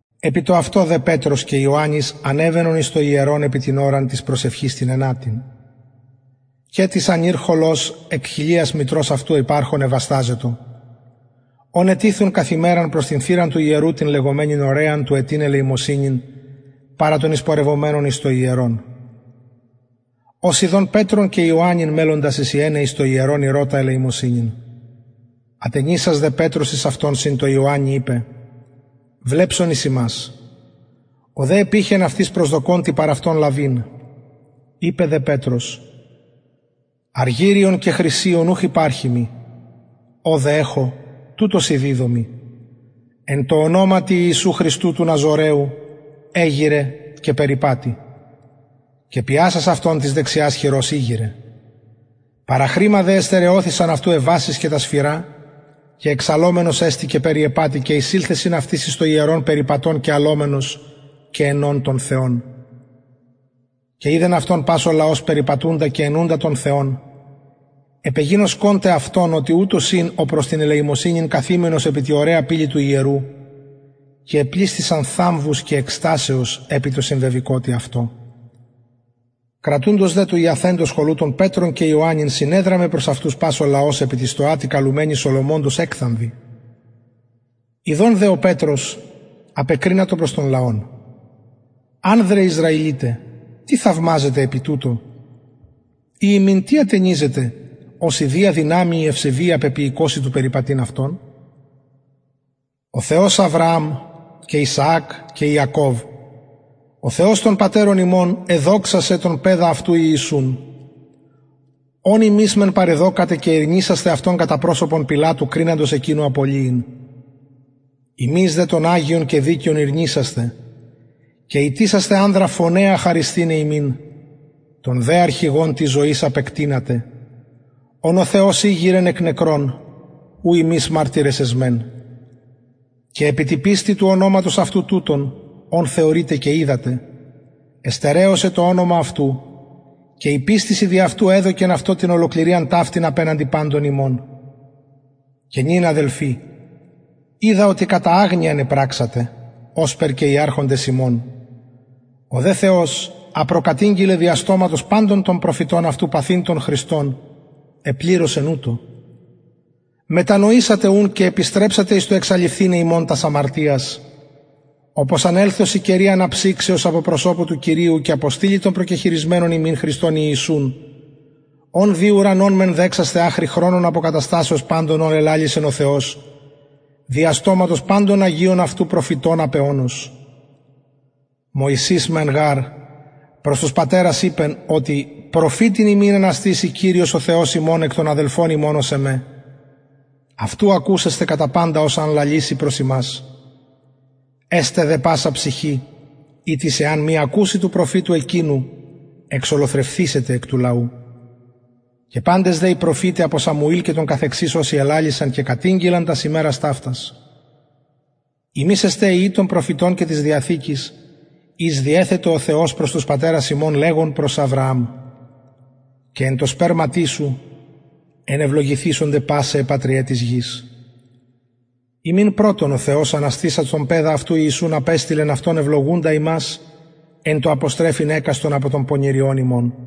επι το αυτο δε πετρος και ιωαννης ανεβαινον εις το ιερον επι την ωραν της προσευχης την ενατην και τις ανηρ χωλος εκ κοιλιας μητρος αυτου υπαρχων εβασταζετο ον ετιθουν καθ ημεραν προς την θυραν του ιερου την λεγομενην ωραιαν του αιτειν ελεημοσυνην παρα των εισπορευομενων εις το ιερον ος ιδων πετρον και ιωαννην μελλοντας εισιεναι εις το ιερον ηρωτα ελεημοσυνην ατενισας δε πετρος εις αυτον συν τω ιωαννη ειπεν βλεψον εις ημας ο δε επειχεν αυτοις προσδοκων τι παρ αυτων λαβειν ειπεν δε πετρος αργυριον και χρυσιον ουχ υπαρχει μοι ο δε εχω τουτο σοι διδωμι εν τω ονοματι ιησου χριστου του ναζωραιου εγειραι και περιπατει και πιασας αυτον της δεξιας χειρος ηγειρεν παραχρημα δε εστερεωθησαν αυτου αι βασεις και τα σφυρα και εξαλλομενος εστη και περιεπατει και εισηλθεν συν αυτοις εις το ιερον περιπατων και αλλομενος και αινων τον θεον και ειδεν αυτον πας ο λαος περιπατουντα και αινουντα τον θεον επεγινωσκον τε αυτον οτι ουτος ην ο προς την ελεημοσυνην καθημενος επι τη ωραια πυλη του ιερου και επλησθησαν θαμβους και εκστασεως επι τω συμβεβηκοτι αυτω κρατουντος δε του ιαθεντος χωλου τον πετρον και ιωαννην συνεδραμεν προς αυτους πας ο λαος επι τη στοα τη καλουμενη σολομωντος εκθαμβοι ιδων δε πετρος απεκρινατο προς τον λαον ανδρες ισραηλιται τι θαυμαζετε επι τουτω η ημιν τι ατενιζετε ως ιδια δυναμει η ευσεβεια πεποιηκοσιν του περιπατειν αυτον ο θεος αβρααμ και ισαακ και ιακωβ ο θεος των πατερων ημων εδοξασεν τον παιδα αυτου ιησουν ον υμεις μεν παρεδωκατε και ηρνησασθε αυτον κατα προσωπον πιλατου κριναντος εκεινου απολυειν υμεις δε τον αγιον και δικαιον ηρνησασθε και ητησασθε ανδρα φονεα χαρισθηναι υμιν τον δε αρχηγον της ζωης απεκτεινατε ον ο θεος ηγειρεν εκ νεκρων ου ημεις μαρτυρες εσμεν και επι τη πιστει του ονοματος αυτου τουτον ον θεωρειτε και οιδατε εστερεωσεν το ονομα αυτου και η πιστις η δι αυτου εδωκεν αυτω την ολοκληριαν ταυτην απεναντι παντων υμων και νυν αδελφοι οιδα οτι κατα αγνοιαν επραξατε ωσπερ και οι αρχοντες υμων ο δε θεος α προκατηγγειλεν δια στοματος παντων των προφητων αυτου παθειν τον χριστον επληρωσεν ουτως μετανοησατε ουν και επιστρεψατε εις το εξαλειφθηναι υμων τας αμαρτιας οπως αν ελθωσιν καιροι αναψυξεως απο προσωπου του κυριου και αποστειλη τον προκεχειρισμενον υμιν χριστον ιησουν ον δει ουρανον μεν δεξασθαι αχρι χρονων αποκαταστασεως παντων ων ελαλησεν ο θεος δια στοματος παντων των αγιων αυτου προφητων απ αιωνος μωσης μεν γαρ προς τους πατερας ειπεν οτι προφητην υμιν αναστησει κυριος ο θεος ημων εκ των αδελφων υμων ως εμε αυτου ακουσεσθε κατα παντα οσα αν λαληση προς υμας εσται δε πασα ψυχη ητις εαν μη ακουση του προφητου εκεινου εξολοθρευθησεται εκ του λαου και παντες δε οι προφηται απο σαμουηλ και των καθεξης οσοι ελαλησαν και κατηγγειλαν τας ημερας ταυτας υμεις εστε υιοι των προφητων και της διαθηκης ης διεθετο ο θεος προς τους πατερας ημων λεγων προς αβρααμ και εν τω σπερματι σου ενευλογηθησονται πασαι αι πατριαι της γης υμιν πρωτον ο θεος αναστησας τον παιδα αυτου ιησουν απεστειλεν αυτον ευλογουντα υμας εν τω αποστρεφειν εκαστον απο των πονηριων υμων